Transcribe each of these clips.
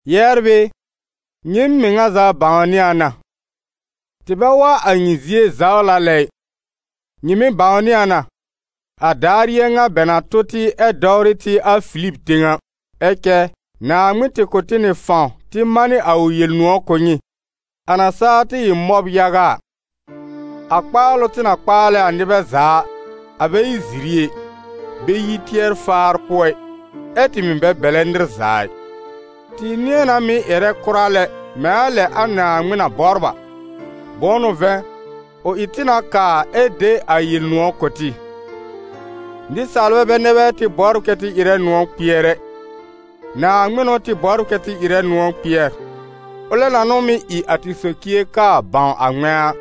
Yɛbr ɩ, nyɩɩm mɩŋa za bãwnɩ a na: tɩ bɛ wa a nyɩ zie zawla lɛ ɩ. Nyɩ mɩ̀ bãwnɩ a na, a daar yɩ̃ɛ ŋa bɛ na tʋ tɩ ɛ dɔwrɩ tɩ a Filib tẽw a. Ɛ cɛ Naaŋmɩn tɩ kʋ̀ tɩ nɩ fãw tɩ manɩ a ʋ Yel-nʋ̃ɔ̀ kʋ̀ nyɩ, a na saa tɩ ɩ mɔb yaga a. A kpaalʋ tɩ na kpaalɛ a nɩbɛ za a, a bɛ ɩ ziri ɛ, bɛ yi tɩɛr-faar pʋɔ ɩ, ɛ́ tɩ mɩ̀ bɛ bɛ̀lɛ nɩr za ɩ. Tɩ nɩ̃ɛ na mɩ́ ƴɛrɛ kʋra lɛ mɛ̃ a lɛ a Naaŋmɩn na bɔbr a, bʋ̃ʋ n'ʋ vɛ̃, ʋ ɩ tɩ na kaa ɛ de a Yel-nʋ̃ɔ̀ kʋ̀ tɩ. Nɩsaalbɛ bɛ nɛ bɛ tɩ bɔbr kɛ tɩ ɩrɛ nʋ̃ɔ̀ kpɩɛr ɛ, Naaŋmɩn n'ʋ tɩ bɔbr kɛ tɩ ɩrɛ nʋ̃ɔ̀ kpɩɛr, ʋlɛ na n'ʋ mɩ́ ɩ a tɩ socie kaa bãw a ŋmɛ̃a.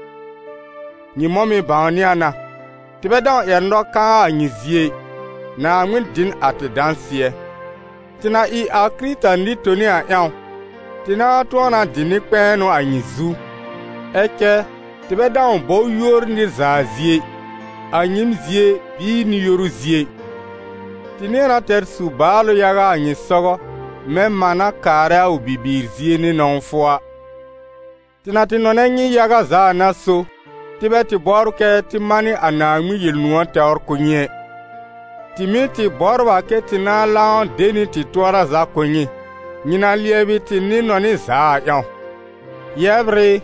Nyɩ mɔ̃ mɩ̀ bãwnɩ a na, tɩ bɛ dãw ƴɛr nɔ-kãa a nyɩ zie ɩ, Naaŋmɩn dɩ n a tɩ dãsɩɛ. Tɩ na ɩ a Kɩrɩta nɩ-toni a ƴãw, tɩ nãá tʋ̃ɔ na dɩ nɩ-kpɛ̃ɛnʋ a nyɩ zu. Ɛ cɛ tɩ bɛ dãw bɔ yúor nɩr za zie ɩ, a nyɩɩm zie bɩɩ nɩ-yoru zie ɩ. Tɩ nɩ̃ɛ na tɛr su-baalʋ yaga a nyɩ sɔgɔ, mɛ̃ mã na kaarɛ a ʋ bibiir zie nɩ nɔ̃wfʋ a. Tɩ na tɩ nɔnɛ nyɩ yaga za a n'a so, tɩ bɛ tɩ bɔbr kɛ́ tɩ manɩ a Naaŋmɩn Yel-nʋ̃ɔ̀ tɛwr kʋ̀ nyɩ ɛ, tɩ mɩ̀ tɩ bɔbr a kɛ́ tɩ nãá lãw de nɩ tɩ tʋɔra za kʋ̀ nyɩ, nyɩ na lɩɛbɩ tɩ nɩ-nɔnɩ za a ƴãw. Yɛbr ɩ,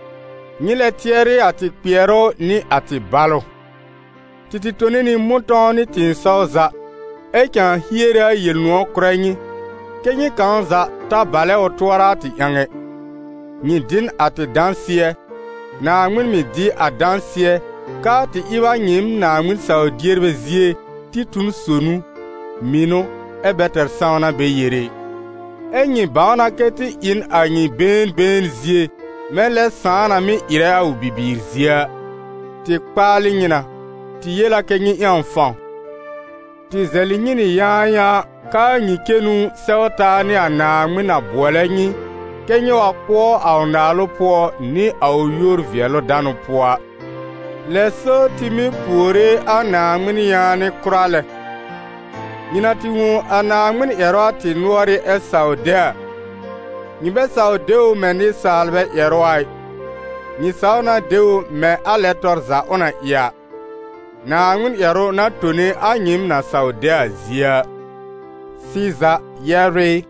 nyɩ lɛ tɩɛrɩ a tɩ kpɩɛrʋ nɩ a tɩ balʋ: tɩ tɩ tone nɩ mʋ̃tɔ̃w nɩ tɩ̃ɩsɔw za, ɛ cãa hiere a Yel-nʋ̃ɔ̀ kʋ̀rɛ nyɩ, kɛ́ nyɩ kãw za ta balɛ ʋ tʋɔra a tɩ ƴãw ɛ. Nyɩ dɩ n a tɩ dãsɩɛ, Naaŋmɩn mɩ̀ dɩ a dãsɩɛ k'aa tɩ ɩb a nyɩɩm Naaŋmɩn saw-dierbɛ zie tɩ tu n sonu, mɩnʋ, ɛ bɛ tɛr sãwna bɛ yere ɩ. Ɛ́ nyɩ bãw na kɛ tɩ ɩ n a nyɩ been been zie mɛ̃ lɛ sãà na mɩ́ ɩrɛ a ʋ bibiir zie a. Tɩ kpaalɩ nyɩ na, tɩ yel a kɛ́ nyɩ ƴãw fãw, tɩ zɛlɩ nyɩ nɩ yãayãa k'aa nyɩ cenu sɛw taa nɩ a Naaŋmɩn na bʋɔlɛ nyɩ kɛ́ nyɩ wa pʋɔ a ʋ naalʋ pʋɔ nɩ a ʋ yúor-vɩɛlʋ-danʋ pʋɔ a. Lɛ so tɩ mɩ́ puore a Naaŋmɩn yaanɩ kʋra lɛ. Nyɩ na tɩ wõ a Naaŋmɩn ƴɛrʋ a tɩ nʋ̀ɔrɩ́ ɛ saw de a, nyɩ bɛ saw de ʋ mɛ̃ nɩsaalbɛ ƴɛrʋ a ɩ, nyɩ saw na de ʋ mɛ̃ a lɛ tɔr za ʋ na ɩ a, Naaŋmɩn ƴɛrʋ na tone a nyɩɩm na saw de a zie a. Sɩza, yɛbr ɩ,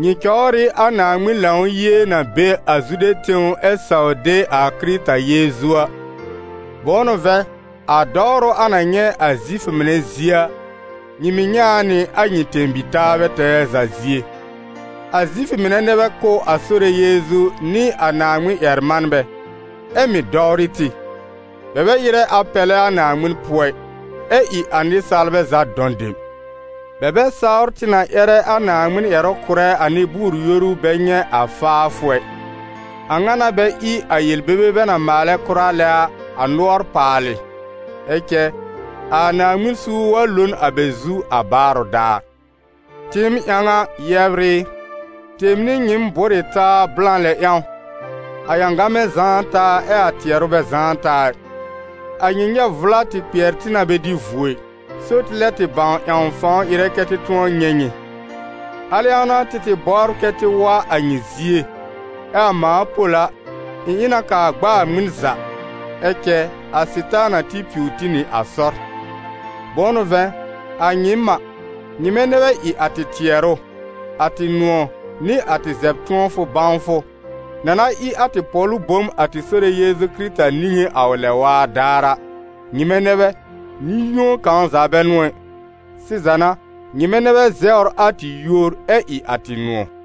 nyɩ cɔwr ɩ a Naaŋmɩn Lãw-yie na be a Zude tẽw ɛ saw de a Kɩrɩta Yeezu a. Bʋ̃ʋ n'ʋ vɛ̃, a dɔwrʋ a na nyɛ̃ a Zifʋ mɩnɛ zie a, nyɩ mɩ̀ nyɛ̃ a nɩ a nyɩ tẽ-bi-taabɛ tɛɛ za zie. A Zifʋ mɩnɛ nɛ bɛ kʋ́ a Sore Yeezu nɩ a Naaŋmɩn ƴɛr-manbɛ, ɛ mɩ̀ dɔwrɩ tɩ, bɛ bɛ ɩrɛ a pɛlɛ a Naaŋmɩn pʋɔ ɩ, ɛ ɩ a nɩsaalbɛ za dɔ̃ dem. Bɛ bɛ sawr tɩ na ƴɛrɛ a Naaŋmɩn ƴɛrʋ kʋ̀rɛ a nɩ-bʋʋr-yoru bɛ nyɛ̃ a faafʋ ɛ, a ŋa n'a bɛ ɩ a yel-bebe bɛ na maalɛ kʋra lɛ a, a nʋɔr paalɩ. Ɛ cɛ a Naaŋmɩn suur wa lo n a bɛ zu a baarʋ daar. Tɩɩm ƴãw a, yɛbr ɩ, tɩɩm nɩ nyɩɩm bʋ́r ɩ taa blã lɛ ƴãw, a ƴãgamɛ zãá taa ɛ a tɩɛrʋ bɛ zãá taa ɩ. A nyɩ nyɛ́b vʋla tɩ kpɩɛr tɩ na bɛ dɩ vuo ɩ, so tɩ lɛb tɩ bãw ƴãw fãw ɩrɛ kɛ́ tɩ tʋ̃ɔ nyɛ̃ nyɩ. Al ƴãw n'a tɩ tɩ bɔbr kɛ tɩ wa a nyɩ zie, ɛ a mãa Pol a, ɩ̃ ɩ na kaa gb'a ŋmɩn za, ɛ cɛ a Sɩtaana tɩ piw tɩ nɩ a sɔr. Bʋ̃ʋ n'ʋ vɛ̃, a nyɩɩm a, nyɩmɛ nɛ bɛ ɩ a tɩ tɩɛrʋ, a tɩ nʋ̃ɔ̀, nɩ a tɩ zɛb-tʋ̃ɔfʋ bãwfʋ, na na ɩ a tɩ pɔ̀lʋ bom a tɩ Sore Yeezu Kɩrɩta niŋé a ʋ lɛ-waa daar a. Nyɩmɛ nɛ bɛ, nɩ-yũo kãw za bɛ n'ʋ ɛ. Sɩza n'a, nyɩmɛ nɛ bɛ zɛwr a tɩ yúor, ɛ ɩ a tɩ nʋ̃ɔ̀.